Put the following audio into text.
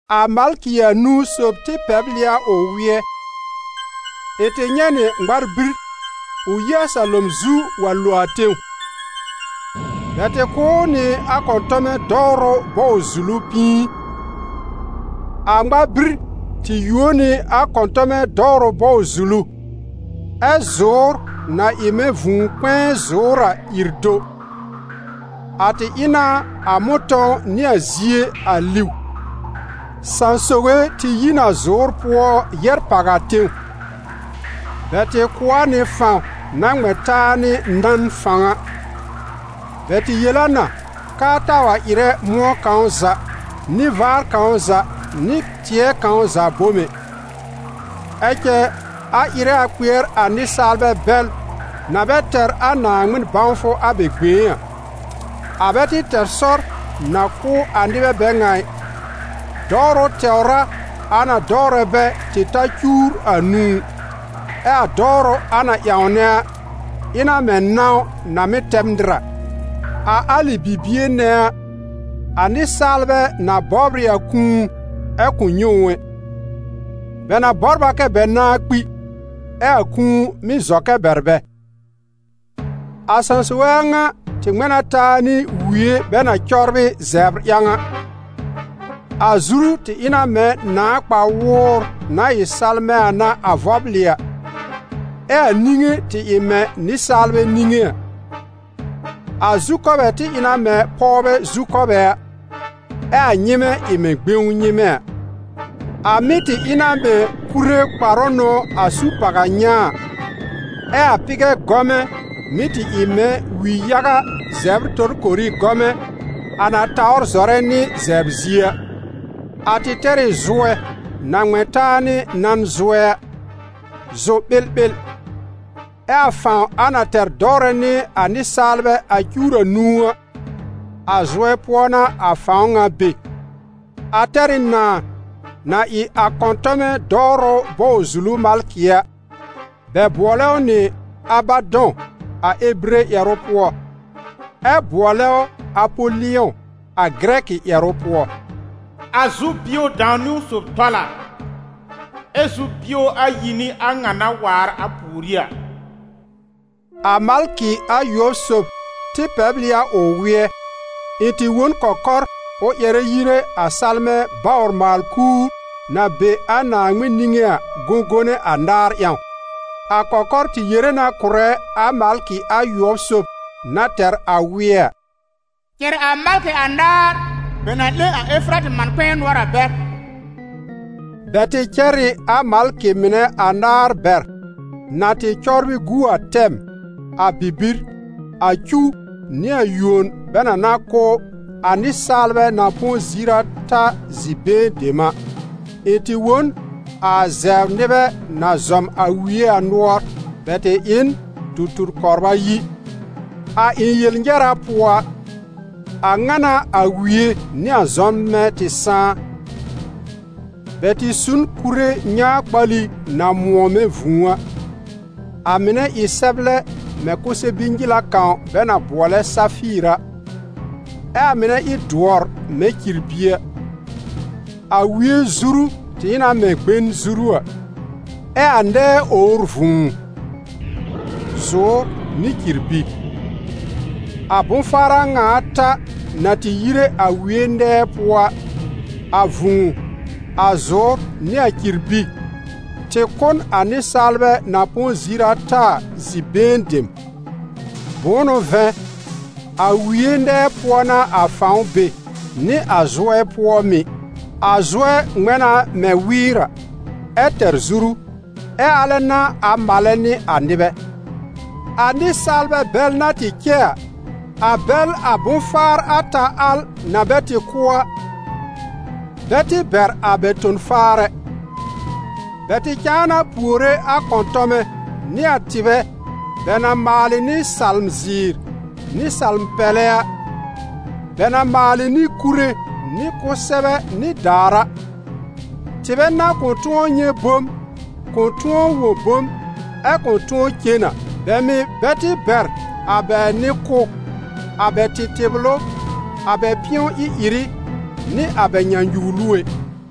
A malkɩ anũu sob tɩ pɛbl ɩ a ʋ wɩ́ɛ; ɩ̃ tɩ nyɛ̃ nɩ ŋmar-bir ʋ yi a salom zu wa lo a tẽw. Bɛ tɩ kʋ̀ ʋ nɩ a kɔ̃tɔmɛ dɔwrʋ bɔw-zulu pĩi. A ŋmar-bir tɩ yuo nɩ a kɔ̃tɔmɛ dɔwrʋ bɔw-zulu, ɛ́ zʋ̀ʋ́r na ɩ mɛ̃ vũu-kpɛ̃ɛ zʋ̀ʋ́r a ìr do. A tɩ ɩ na a mʋ̃tɔ̃w nɩ a zie a liw. Sãsoge tɩ yi n a zʋ̀ʋ́r pʋɔ yɛ́r pàw a tẽw; bɛ tɩ kʋ̀ a nɩ fãw na ŋmɛ̃ taa nɩ nan fãw a. Bɛ tɩ yel a na k'aa taa wa ɩrɛ mʋ̃ɔ kãw za, nɩ vaar kãw za, nɩ tɩɛ kãw za bom ɛ; ɛ cɛ, a ɩrɛ a kpɩɛr a nɩsaalbɛ bɛl na bɛ tɛr a Naaŋmɩn bãwfʋ a bɛ gbẽé a. A bɛ tɩ tɛr sɔr na kʋ́ a nɩbɛ bɛ ŋa ɩ, dɔwrʋ tɛwr a a na dɔwrɛ bɛ tɩ ta cuwr anũu. Ɛ a dɔwrʋ a na ƴãwnɛ a, ɩ na mɛ̃ nãw na mɩ́ tɛb nɩr a. A alɩ bibie nɛ a, a nɩsaalbɛ na bɔbr ɩ a kũu ɛ kʋ̃ nyɛ̃ ʋ ɛ; bɛ na bɔbr a kɛ bɛ nãá kpi, ɛ a kũu mɩ́ zɔ kɛ bɛr bɛ. A sãsoge a ŋa tɩ ŋmɛ̃ na taa nɩ wie bɛ na cɔbrɩ zɛbr ƴãw a; a zuru tɩ ɩ na mɛ̃ nãà kpa-wʋʋr na ɩ salmɛ̃ a n'a a vɔblɩ a, ɛ a niŋe tɩ ɩ mɛ̃ nɩsaalbɛ niŋe a. A zukɔbɛ tɩ ɩ na mɛ̃ pɔwbɛ zukɔbɛ a, ɛ a nyɩmɛ́ ɩ mɛ̃ gbẽw nyɩmɛ́ a. A mɩ́ tɩ ɩ na mɛ̃ kure kparʋ n'ʋ a su pàw a nyãa a, ɛ a pɩgɛ gɔmɛ mɩ́ tɩ ɩ mɛ̃ wi-yaga zɛbr-torkori gɔmɛ, a na tawr zɔrɛ nɩ zɛbr zie a. A tɩ tɛr ɩ zʋɛ na ŋmɛ̃ taa nɩ nan zʋɛ a, zʋ-ɓɩlɓɩl, ɛ a fãw a na tɛr dɔwrɛ nɩ a nɩsaalbɛ a cuwr anũu a, a zʋɛ pʋɔ n'a a fãw ŋa be. A tɛr ɩ nãa, na ɩ a kɔ̃tɔmɛ dɔwrʋ bɔw-zulu malkɩ a; bɛ bʋɔlɛ ʋ nɩ «Abadɔ̃» a ebire ƴɛrʋ pʋɔ, ɛ bʋɔlɛ ʋ «Apolɩ̃ɔ», a gɩrɛkɩ ƴɛrʋ pʋɔ. A zu-bio dãw-niwn sob tɔl a, ɛ zu-bio ayi n'ɩ a ŋa na waar a pùorí a. A malkɩ ayʋɔb sob tɩ pɛbl ɩ a ʋ wɩ́ɛ; ɩ̃ tɩ wõ n kɔkɔr ʋ ƴɛrɛ yire a salmɛ̃ bawr-maal-kuur, na be a Naaŋmɩn niŋé a, gõgone anaar ƴãw. A kɔkɔr tɩ yere na kʋ̀rɛ a malkɩ ayʋɔb sob na tɛr a wɩ́ɛ a: «Cɛr a malkɩ anaar bɛ na 'lẽ a Efaratɩ man-kpɛ̃ɛ nʋɔr a bɛr.» Bɛ tɩ cɛr ɩ a malkɩ mɩnɛ anaar bɛr na tɩ cɔbrɩ gu a tɛm, a bibir, a cuw nɩ a yuon bɛ na na kʋ́ a nɩsaalbɛ na põ ziir ata zi-been dem a. Ɩ̃ tɩ wõ n a zɛbr nɩbɛ na zɔm a wie a nʋɔr: bɛ tɩ ɩ n tu-tur kɔbr ayi. A ɩ̃ yel-nyɛra pʋɔ a, a ŋa n'a a wie nɩ a zɔmnbɛ tɩ sãá: bɛ tɩ su n kure nyãa-kpali na mʋ̃ɔ mɛ̃ vũu a, a mɩnɛ ɩ sɛblɛ mɛ̃ kʋsɛ-bi-nyɩla kãw bɛ na bʋɔlɛ safɩɩr a, ɛ a mɩnɛ ɩ dʋɔr mɛ̃ cirbi a. A wie zuru tɩ ɩ na mɛ̃ gben zuru a, ɛ a nɛɛ owr vũu, zʋ̀ʋ́r nɩ cirbi. A bʋ̃-faar a ŋa ata na tɩ yire a wie nɛɛ pʋɔ a, a vũu, a zʋ̀ʋ́r nɩ a cirbi, tɩ kʋ́ n a nɩsaalbɛ na põ ziir ata a zi-been dem. Bʋ̃ʋ n'ʋ vɛ̃, a wie nɛɛ pʋɔ n'a a fãw be, nɩ a zʋɛ pʋɔ mɩ̀. A zʋɛ ŋmɛ̃ na mɛ̃ wɩɩr a, ɛ tɛr zuru, ɛ alɛ n'a a malɛ nɩ a nɩbɛ. A nɩsaalbɛ bɛl na tɩ cɛ a, a bɛl a bʋ̃-faar ata al na bɛ tɩ kʋ́ a, bɛ tɩ bɛr a bɛ ton-faar ɛ, bɛ tɩ cãa na puore a kɔ̃tɔmɛ nɩ a tɩbɛ bɛ na maalɩ nɩ salm-ziir nɩ salm-pɛlɛ a, bɛ na maalɩ nɩ kure nɩ kʋsɛbɛ nɩ daàr a, tɩbɛ na kʋ̃ tʋ̃ɔ nyɛ̃ bom, kʋ̃ tʋ̃ɔ wõ bom ɛ kʋ̃ tʋ̃ɔ cen a. Bɛ mɩ̀ bɛ tɩ bɛr a bɛ nɩ-kʋ́, a bɛ tɩtɩblʋ, a bɛ pɩ̃ɔ ɩ-ɩrɩ, nɩ a bɛ nyãnyuwlu ɛ.